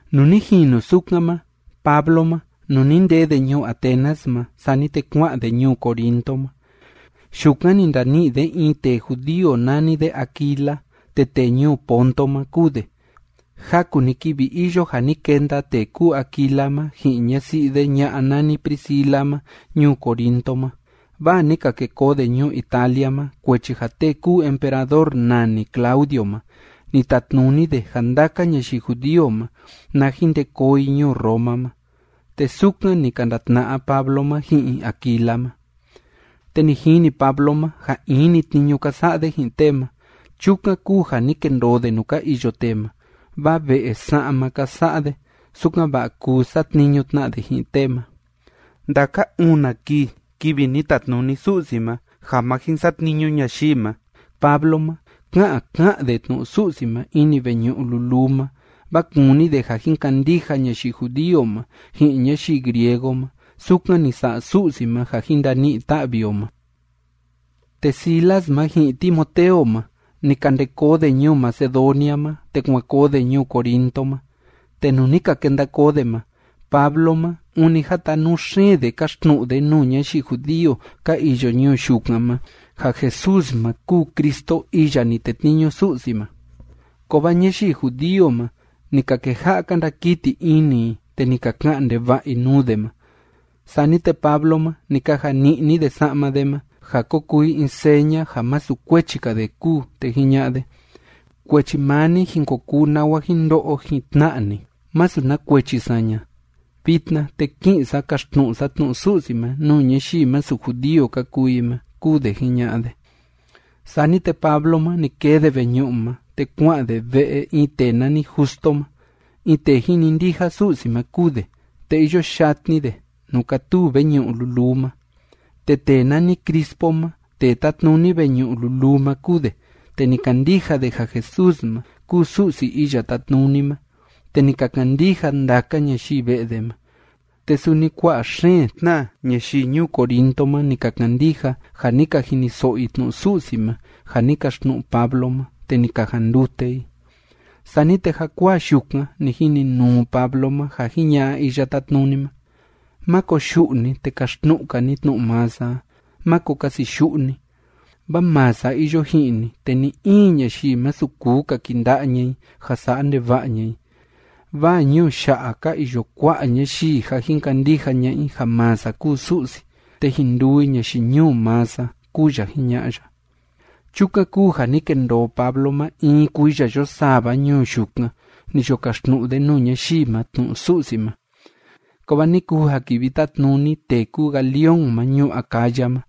Nuu ni jinu sukan ma, Pablo ma, nuu ni ndee de ñuu Atenas ma, sani te kua'an de ñuu Corinto ma. Yukan ni ndani'i de in tee judío nani de Aquila. Te tee ñuu Ponto ma kúu de. Jaku‑ni kivi iyo ja ni kenda tee kúu Aquila ma ji'in ñasi'i de ña'a nani Priscila ma ñuu Corinto ma, vaa ni ka ke koo de ñuu Italia ma, kuechi ja tee kúu emperador nani Claudio ma, ni tatnuni de ja ndaka ñayii judío ma, na jin nde koo i ñuu Roma ma. Te sukan ni ka ndatna'a Pablo ma ji'in Aquila ma. Te ni jini Pablo ma ja in‑ni tniñu ka sa'a de ji'in tee ma. Chukan kúu ja ni kendoo de nuu ka iyo tee ma, vaa ve'e sa'ma ka sa'a de, sukan‑va'a kuu satniñu tna de ji'in tee ma. Ndaka una kii, kivi ni tatnuni Su'si ma ja ma jin satniñu ñayii ma, Pablo ma ká'an ká'an de tnu'u Su'si ma ini veñu'u luluu ma, vaa kúni de ja jin kandija ñayii judío ma ji'in ñayii griego ma sukan ni sa'a Su'si ma ja jin ndani'i ta'vi o ma. Te Silas ma ji'in Timoteo ma, ni ka nde koo de ñuu Macedonia ma, te kuan koo de ñuu Corinto ma. Te nuu ni ka kenda koo de ma, Pablo ma, ûni jatanuu xeen de káxtnu'u de nuu ñayii judío ka iyo ñuu yukan ma, ja Jesús ma kúu Cristo iya ni tetniñu Su'si ma. Kovaa ñayii judío ma, ni ka keja'a ka ndakiti ini i, te ni ka ka'an ndeva'a i nuu de ma. Sani te Pablo ma, ni kaja ni'ni de sa'ma de ma, ja ko kuu i in seña ja masu kuechi‑ka de kúu, te jiña'a de: ―Kuechi maa ni jin ko kuu nawa jin ndo'o jin tna'a ni. Masu na kuechi saña. Vitna, te ki'in sa kaxtnu'u sa tnu'u Su'si ma nuu ñayii masu judío ka kuu i ma ―kúu de jiña'a de. Sani te Pablo ma, ni kee de veñu'u ma, te kua'an de ve'e in tee nani Justo ma. In tee jinindija Su'si ma kúu de, te iyo yatni de nuu kátuu veñu'u luluu ma. Te tee nani Crispo ma, tee tátnuni veñu'u luluu ma kúu de, te ni kandija de ja Jesús ma kúu Su'si Iya Tátnuni ma, te ni ka kandija ndaka ñayii ve'e de ma, te suni kua'a xeen tna ñayii ñuu Corinto ma ni ka kandija ja ni ka jiniso'o i tnu'u Su'si ma ja ni kaxtnu'u Pablo ma, te ni ka jandute i. Sani te jakuaa yukan ni jininuu Pablo ma ja jiña'a Iya Tátnuni ma: ―Má koyu'u ni, te kaxtnu'u‑ka ni tnu'u maa sa a. Máko kasiyu'u ni. Vaa maa sa iyo ji'in ni, te ni‑in ñayii masu kuu kaki'i nda'a ña'a i ja sa'a ndeva'a ña'a i, vaa ñuu ya'a ka iyo kua'a ñayii ja jin kandija ña'a i ja maa sa kúu Su'si, te jin nduu i ñayii ñuu maa sa ―kúu ya jiña'a ya. Chukan kúu ja ni kendoo Pablo ma in kuiya yo sava ñuu yukan, ni yo kaxtnu'u de nuu ñayii ma tnu'u Su'si ma. Kovaa ni kuu ja kivi tátnuni tee kúu Galión ma ñuu Acaya ma,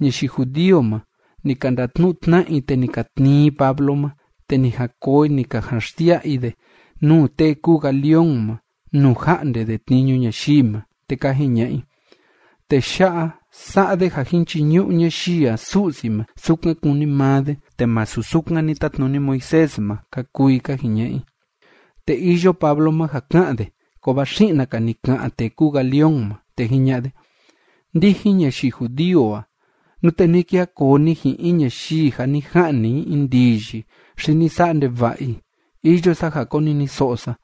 ñayii judío ma, ni ka ndatnu'u tna'a i, te ni ka tnii i Pablo ma te ni jan koo i ni ka jan xsia'a i de nuu tee kúu Galión ma nuu ja'nde de tniñu ñayii ma. Te ka jiña'a i: ―Tee ya'a, sa'a de ja jin chiñu'u ñayii a Su'si ma sukan kúni maa de, te masu sukan ni tatnuni Moisés ma ―ka kuu i ka jiña'a i. Te iyo Pablo ma ja ka'an de, kovaa xi'na‑ka ni ka'an tee kúu Galión ma, te jiña'a de: ―Ndijin ñayii judío a, nute ni kija koo ni ji'in in ñayii ja ni ja'ni i in ndiyi xi ni sa'a ndeva'a i, iyo sa ja koniniso'o sa.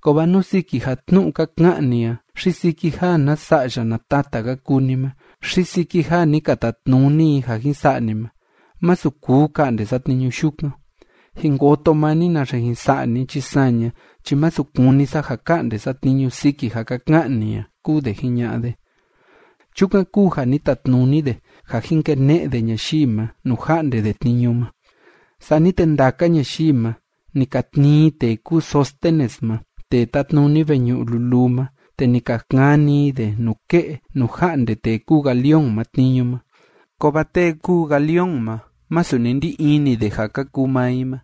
Kovaa nú siki ja tnu'u ka ka'an ni a xi siki ja na sa'ya na tata ka kuu ni ma xi siki ja ni ka tatnuni i ja jin sa'a ni ma, masu kuu ka'nde sa tniñu yukan. Jin koto maa ni naxe jin sa'a ni chi saña chi masu kúni sa ja ka'nde sa tniñu siki ja ka ka'an ni a ―kúu de jiña'a de. Chukan kúu ja ni tatnuni de ja jin kene'e de ñayii ma nuu ja'nde de tniñu ma. Sani te ndaka ñayii ma, ni ka tnii i tee kúu Sóstenes ma tee tátnuni veñu'u luluu ma, te ni ka kani i de nuke'e nuu ja'nde tee kúu Galión ma tniñu ma. Kovaa tee kúu Galión ma masu ni ndi ini de ja ka kuu maa i ma.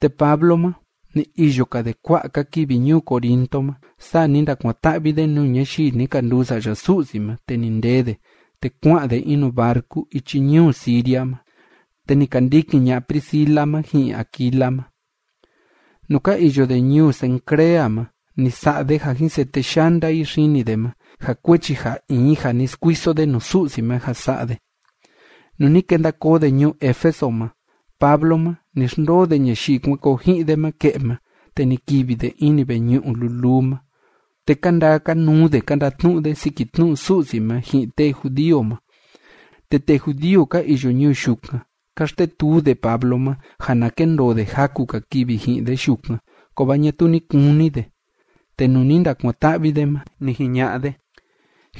Te Pablo ma ni iyo‑ka de kua'a‑ka kivi ñuu Corinto ma, saa ni ndakuan‑ta'vi de nuu ñayii ni ka nduu sa'ya Su'si ma, te ni ndee de, te kua'an de in nuu barcu ichi ñuu Siria ma, te ni ka ndikin ña'a Priscila ma ji'in Aquila ma. Nuu ka iyo de ñuu Cencrea ma, ni sa'a de ja jin sete yanda i xini de ma, ja kuechi ja in ja ni skuiso de nuu Su'si ma ja sa'a de. Nuu ni kenda koo de ñuu Éfeso ma, Pablo ma, ni xndoo de ñayii kuan koo ji'in de ma ke'e ma, te ni kivi de ini veñu'u luluu ma, te ka ndaa ka nuu de ka ndatnu'u de siki tnu'u Su'si ma ji'in tee judío ma. Te tee judío ka iyo ñuu yukan, ka xtetuu de Pablo ma ja na kendoo de jaku‑ka kivi ji'in de yukan. Kovaa ñatuu ni kuni de. Te nuu ni ndakuan‑ta'vi de ma, ni jiña'a de: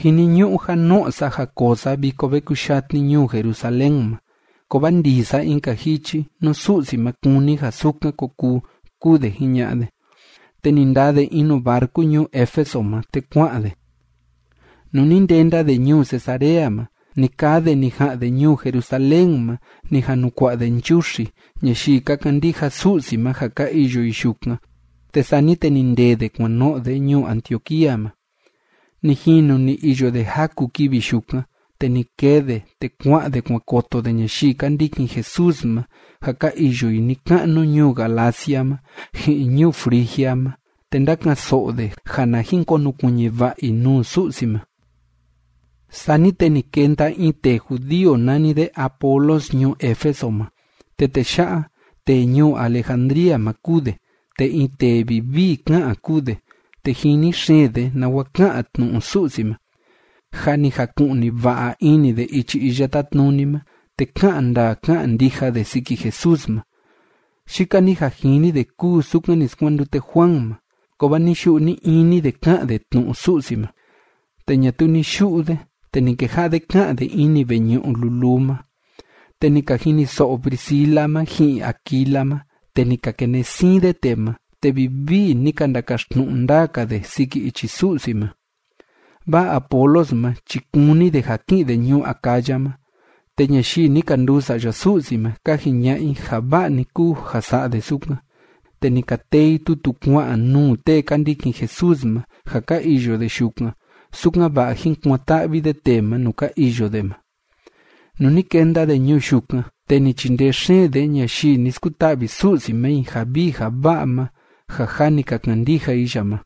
―Jiniñu'u ja no'o sa ja koo sa viko ve kuyatni ñuu Jerusalén ma, kovaa ndii sa in‑ka jichi, nú Su'si ma kúni ja sukan ko kuu ―kúu de jiña'a de. Te ni ndaa de in nuu barcu ñuu Éfeso ma, te kua'an de. Nuu ni ndenda de ñuu Cesarea ma, ni kaa de ni ja'an de ñuu Jerusalén ma ni jan nu kua'a de nchuxi ñayii ka kandija Su'si ma ja ka iyo i yukan, te sani te ni ndêe de kuan no'o de ñuu Antioquía ma. Ni jinu ni iyo de jaku kivi yukan, te ni kee de, te kua'an de kuan koto de ñayii ka ndikin Jesús ma ja ka iyo i ni‑ka'nu ñuu Galacia ma ji'in ñuu Frigia ma, te ndáka'an‑so'o de ja na jin konukuiñi va'a i nuu Su'si ma. Sani te ni kenda in tee judío nani de Apolos ñuu Éfeso ma. Te tee ya'a, tee ñuu Alejandría ma kúu de, te in tee vivii ká'an kúu de, te jini xeen de nawa ká'an tnu'u Su'si ma. Jâ ni jaku'ni va'a ini de ichi Iya Tátnuni ma, te ká'an ndaa ká'an ndija de siki Jesús ma. Yika‑ni ja jini de kúu sukan ni skuandute Juan ma, kovaa ni‑yu'u ni‑ini de ká'an de tnu'u Su'si ma. Te ñatuu ni yu'u de, te ni keja'a de ká'an de ini veñu'u luluu ma. Te ni ka jiniso'o Priscila ma ji'in Aquila ma, te ni ka kene'e siin de tee ma, te vivii ni ka ndakaxtnu'u ndaa‑ka de siki ichi Su'si ma. Vaa Apolos ma chi kúni de ja ki'in de ñuu Acaya ma. Te ñayii ni ka nduu sa'ya Su'si ma, ka jiña'a i ja va'a‑ni kúu ja sa'a de sukan, te ni ka tee i tutu kua'an nuu tee ka ndikin Jesús ma ja ka iyo de yukan, sukan‑va'a jín kuan‑ta'vi de tee ma nuu ka iyo de ma. Nuu ni kenda de ñuu yukan, te ni chindee xeen de ñayii ni skuta'vi Su'si ma i ja vii ja va'a ma ja jâ ni ka kandija i ya ma.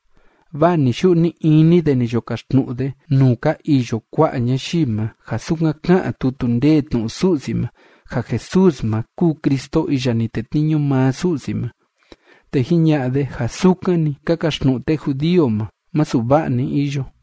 Vaa ni‑yu'u ni‑ini de ni yo kaxtnu'u de nuu ka iyo kua'a ñayii ma ja sukan ká'an tutu ndee tnu'u Su'si ma ja Jesús ma kúu Cristo iya ni tetniñu maa Su'si ma, te jiña'a de ja sukan‑ni ka kaxtnu'u tee judío ma, masu va'a‑ni iyo.